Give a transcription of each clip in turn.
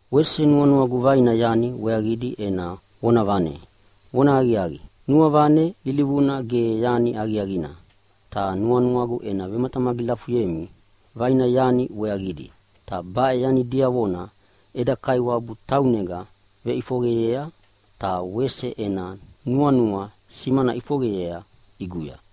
Wese nuanuagu vaina yani weaqidi ena vonavane. Vonahaqiaqi, nuavane ilivuna ge yani aqiaqina, ta nuanuagu ena vematamagilafuyemi vaina yani weaqidi, ta baʼe yani diavona eda Kaiwabu taunega veʼifoqeyea, ta wese ena nuanua simana ʼifoqeyea ʼiguya.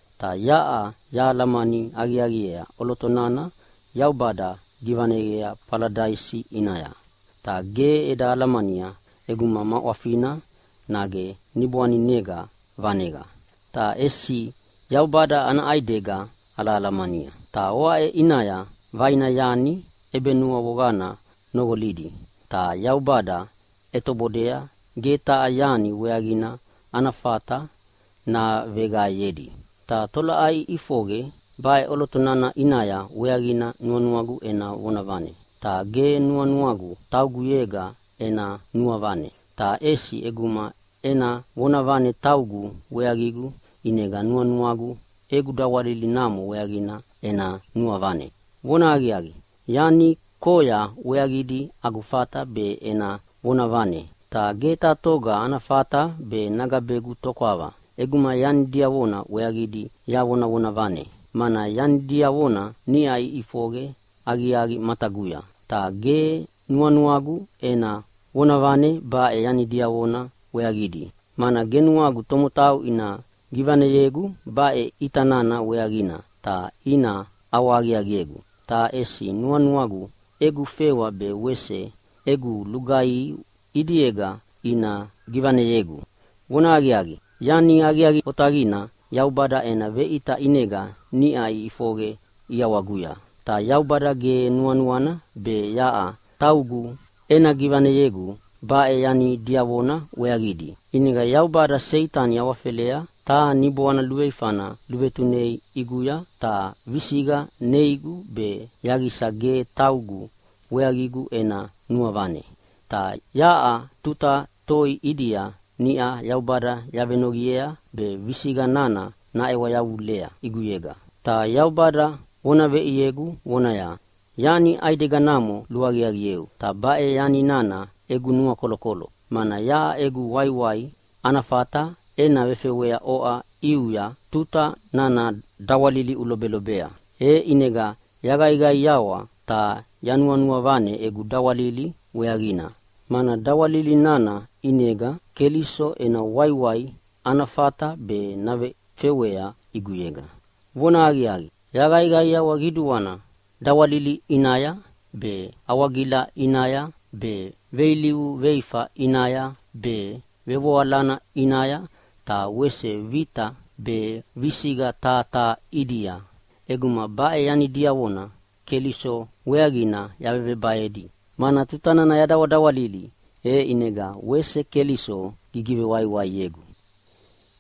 Ta yaʼa yahalamani aqiaqiea ʼoloto nana Yaubada givaneyea Faladaisi ʼinaya, ta ge eda alamania ʼeguma ma ʼwafina nage niboaninega vaneqa, ta ʼesi Yaubada ana ʼaidega alahalamania. Ta oaʼe ʼinaya vaina yani ʼebenuavoqana noqolidi. Ta Yaubada ʼetobodea ge taha yani weaqina ana fata naveqaeyedi. Ta tolaʼai ʼifoqe baʼe ʼoloto nana ʼinaya weaqina nuanuagu ena vonavane, ta ge nuanuagu tauguyega ena nuavane. Ta ʼesi ʼeguma ena vonavane taugu weaqigu ʼinega nuanuagu egu dawalili namo weaqina ena nuavane. Vonahaqiaqi, yani koya weaqidi agu fata be ena vonavane. Ta ge taha toga ana fata be nagabegu tokwava ʼeguma yani diavona weaqidi yavonavonavane, mana yani diavona niʼa iʼifoqe aqiaqi mataguya. Ta ge nuanuagu ena vonavane baʼe yani diavona weaqidi, mana ge nuagu tomotau ina givaneyegu baʼe ʼita nana weaqina ta ina ʼawahaqiaqiegu, ta ʼesi nuanuagu egu fewa be wese egu lugaihi ʼidiega ina givaneyegu. Vonahaqiaqi, yani aqiaqi otaqina Yaubada ena veʼita ʼinega niʼa iʼifoqe ʼiawaguya. Ta Yaubada ge nuanuana be yaʼa taugu ena givaneyegu baʼe yani diavona weaqina, ʼinega Yaubada Seitani awafelea taha niboana luveifana luvetunei ʼiguya ta visiqa neigu be yaqisa ge taugu weaqigu ena nuavane. Ta yaʼa tuta toi ʼidia niʼa Yaubada yavenoqiea be visiqa nana naʼewa yavulea ʼiguyega. Ta Yaubada vona veʼiegu vonaya, “Yani ʼaideganamo luaqiaqieu, ta baʼe yani nana egu nuakolokolo. Mana yaʼa egu waiwai ana fata ena vefewea oʼa ʼiuya tuta nana dawalili ulobelobea.” E ʼinega yaqaiqaiawa ta yanuavane egu dawalili weaqina, mana dawalili nana ʼinega Keliso ena waiwai ana fata be navefewea ʼiguyega. Vonahaqiaqi, yaqaiqaiawa qiduana dawalili ʼinaya be, awagila ʼinaya be, veilivu veifa ʼinaya be, vevoalana ʼinaya ta wese vita be visiqa taha taha ʼidia, ʼeguma baʼe yani diavona Keliso weaqina yavevebaedi. Mana tuta nana yadawadawalili, e ʼinega wese Keliso gigivewaiwaiegu.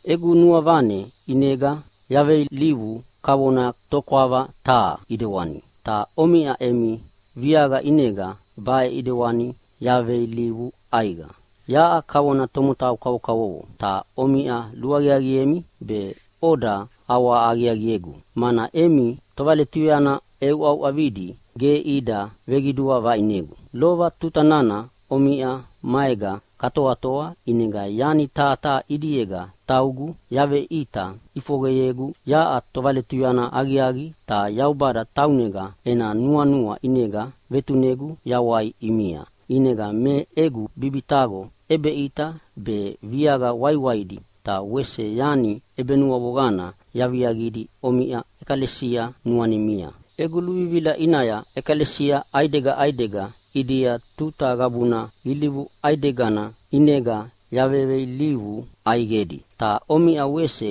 Egu nuavane ʼinega yaveilivu kavona tokwava taha ʼidewani, ta omiʼa emi viaqa ʼinega baʼe ʼidewani yaveilivu ʼaiqa. Yaʼa kavona tomotau kavokavovo, ta omiʼa luaqiaqiemi be oda ʼawahaqiaqiegu, mana emi tovaletuyana ʼeuʼauʼavidi ge ida veqidua vaʼinegu. Lova tuta nana omiʼa maega katoatoa ʼinega yani taha taha ʼidiega taugu yaveʼita ʼifoqeyegu yaʼa tovaletuyana aqiaqi ta Yaubada taunega ena nuanua ʼinega vetunegu yawai ʼimia. ʼInega me egu bibitaqo ʼebeʼita be, viaqa waiwaidi ta wese yani ʼebenuavoqana yaviaqidi omiʼa ʼekalesia nuanimia. Egu luvivila ʼinaya ʼekalesia ʼaidega ʼaidega ʼidia tuta qabuna ilivu ʼaidegana ʼinega yaveilivu ʼaiqedi. Ta omiʼa wese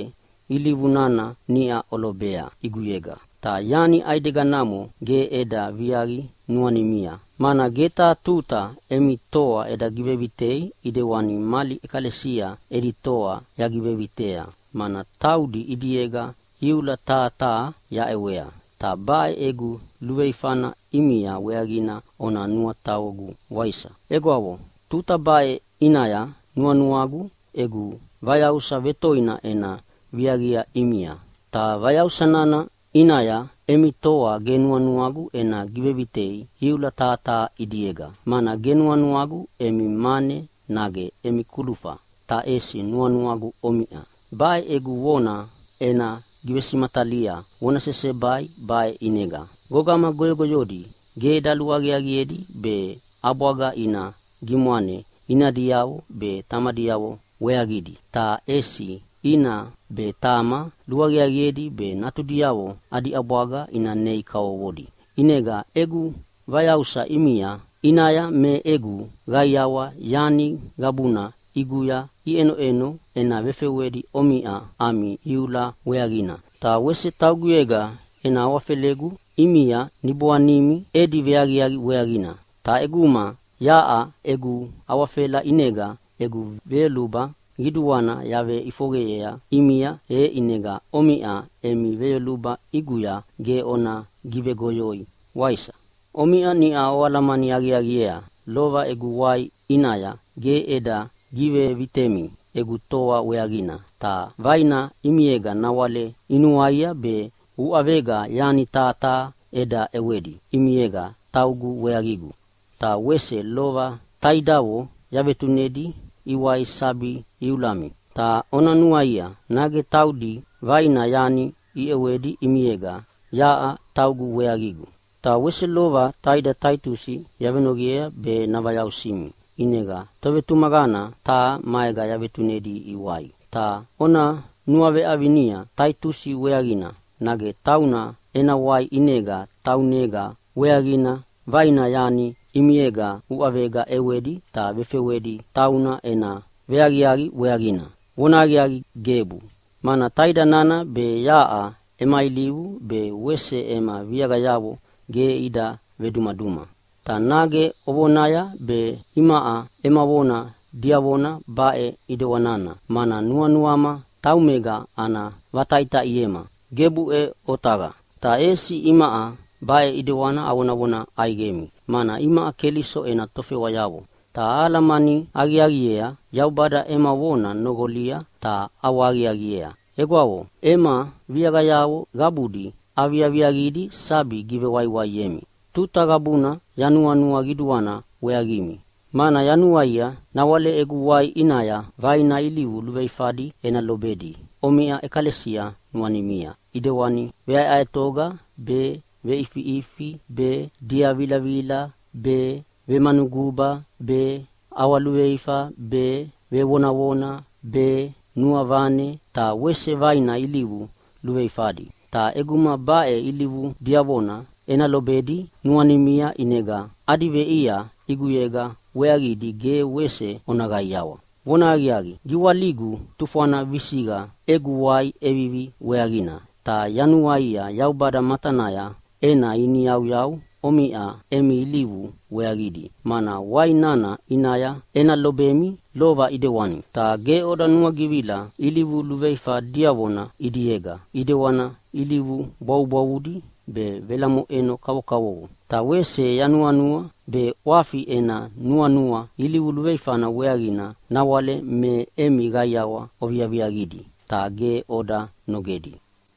ilivu nana niʼa olobea ʼiguyega. Ta yani ʼaideganamo ge eda viaqi nuanimia, mana ge taha tuta emi toa eda givevitei ʼidewani mali ʼekalesia edi toa yagivevitea, mana taudi ʼidiega iula taha taha yaʼewea. Ta baʼe egu luveifana ʼimia weaqina ona nuataqogu, waisa? Egwavo, tuta baʼe ʼinaya nuanuagu egu vayausa vetoina ena viaqia ʼimia. Ta vayausa nana ʼinaya emi toa ge nuanuagu ena givevitei iula taha taha ʼidiega. Mana ge nuanuagu emi mane nage emi kulufa, ta ʼesi nuanuagu omiʼa. Baʼe egu vona ena givesimatalia vona sesebai baʼe ʼinega. Gogama goyogoyodi ge daluaqiaqiedi be ʼabwaga ina gimwane inadiavo be tamadiavo weaqidi, ta ʼesi ina be tama luaqiaqiedi be natudiavo adi ʼabwaga ina nei kavovodi. ʼInega egu vayausa ʼimia ʼinaya me egu qaiawa yani qabuna ʼiguya iʼenoʼeno ena vefewedi omiʼa ami iula weaqina, ta wese tauguyega ena awafelegu ʼimia niboanimi edi veaqiaqi weaqina. Ta ʼeguma yaʼa egu awafela ʼinega egu veyoluba qiduana yaveʼifoqeyea ʼimia, e ʼinega omiʼa emi veyoluba ʼiguya ge ona givegoyoi, waisa? Omiʼa niʼa oalamani aqiaqiea lova egu wai ʼinaya ge eda givevitemi egu toa weaqina. Ta vaina ʼimiega nawale inuaia be uʼavega yani taha taha eda ʼewedi ʼimiega taugu weaqigu. Ta wese lova taidavo yavetunedi iwai sabi iulami. Ta ona nuaia, nage taudi vaina yani iʼewedi ʼimiega yaʼa taugu weaqigu? Ta wese lova taida Taitusi yavenoqiea be navayausimi, ʼinega tovetumaqana taha maega yavetunedi iwai. Ta ona nuaveʼavinia Taitusi weaqina, nage tauna ena wai ʼinega taunega weaqina vaina yani ʼimiega uʼavega ʼewedi ta vefewedi tauna ena veaqiaqi weaqina? Vonahaqiaqi, gebu! Mana taida nana be yaʼa ema ilivu be wese ema viaqayavo ge ida vedumaduma. Ta nage ovonaya be imaʼa ema vona diavona baʼe ʼidewanina, mana nuanuama taumega ana vataʼitaʼiema. Gebuʼe otaqa! Ta ʼesi imaʼa baʼe ʼidewani avonavona ʼaiqemi, mana imaʼa Keliso ena tofewayavo, ta ahalamani aqiaqiea Yaubada ema vona noqolia ta ʼawahaqiaqiea. Egwavo, ema viaqayavo qabudi aviaviaqidi sabi givewaiwaiemi. Tuta qabuna yanuanua qiduana weaqimi, mana yanuaia nawale egu wai ʼinaya vaina ilivu luveifadi ena lobedi omiʼa ʼekalesia nuanimia, ʼidewani veʼaeʼaetoga be, veʼifiʼifi be, diavilavila be, vemanuguba be, ʼawaluveifa be, vevonavona be, nuavane ta wese vaina ilivu luveluveifadi. Ta ʼeguma baʼe ilivu diavona ena lobedi nuanimia ʼinega adi veʼia ʼiguyega weaqidi ge wese ona qaiawa. Vonahaqiaqi, giwaligu tufwana visiqa egu wai ʼevivi weaqina, ta yanuaia Yaubada matanaya ena iniyauyau omiʼa emi ilivu weaqidi, mana wai nana ʼinaya ena lobemi lova ʼidewani, ta ge oda nuagivila ilivu luveifa diavona ʼidiega ʼidewani ilivu bwavubwavudi be velamoʼeno kavokavovo. Ta wese yanuanua be ʼwafi ena nuanua ilivu luveifana weaqina nawale me emi qaiawa oviaviaqidi, ta ge oda nogedi.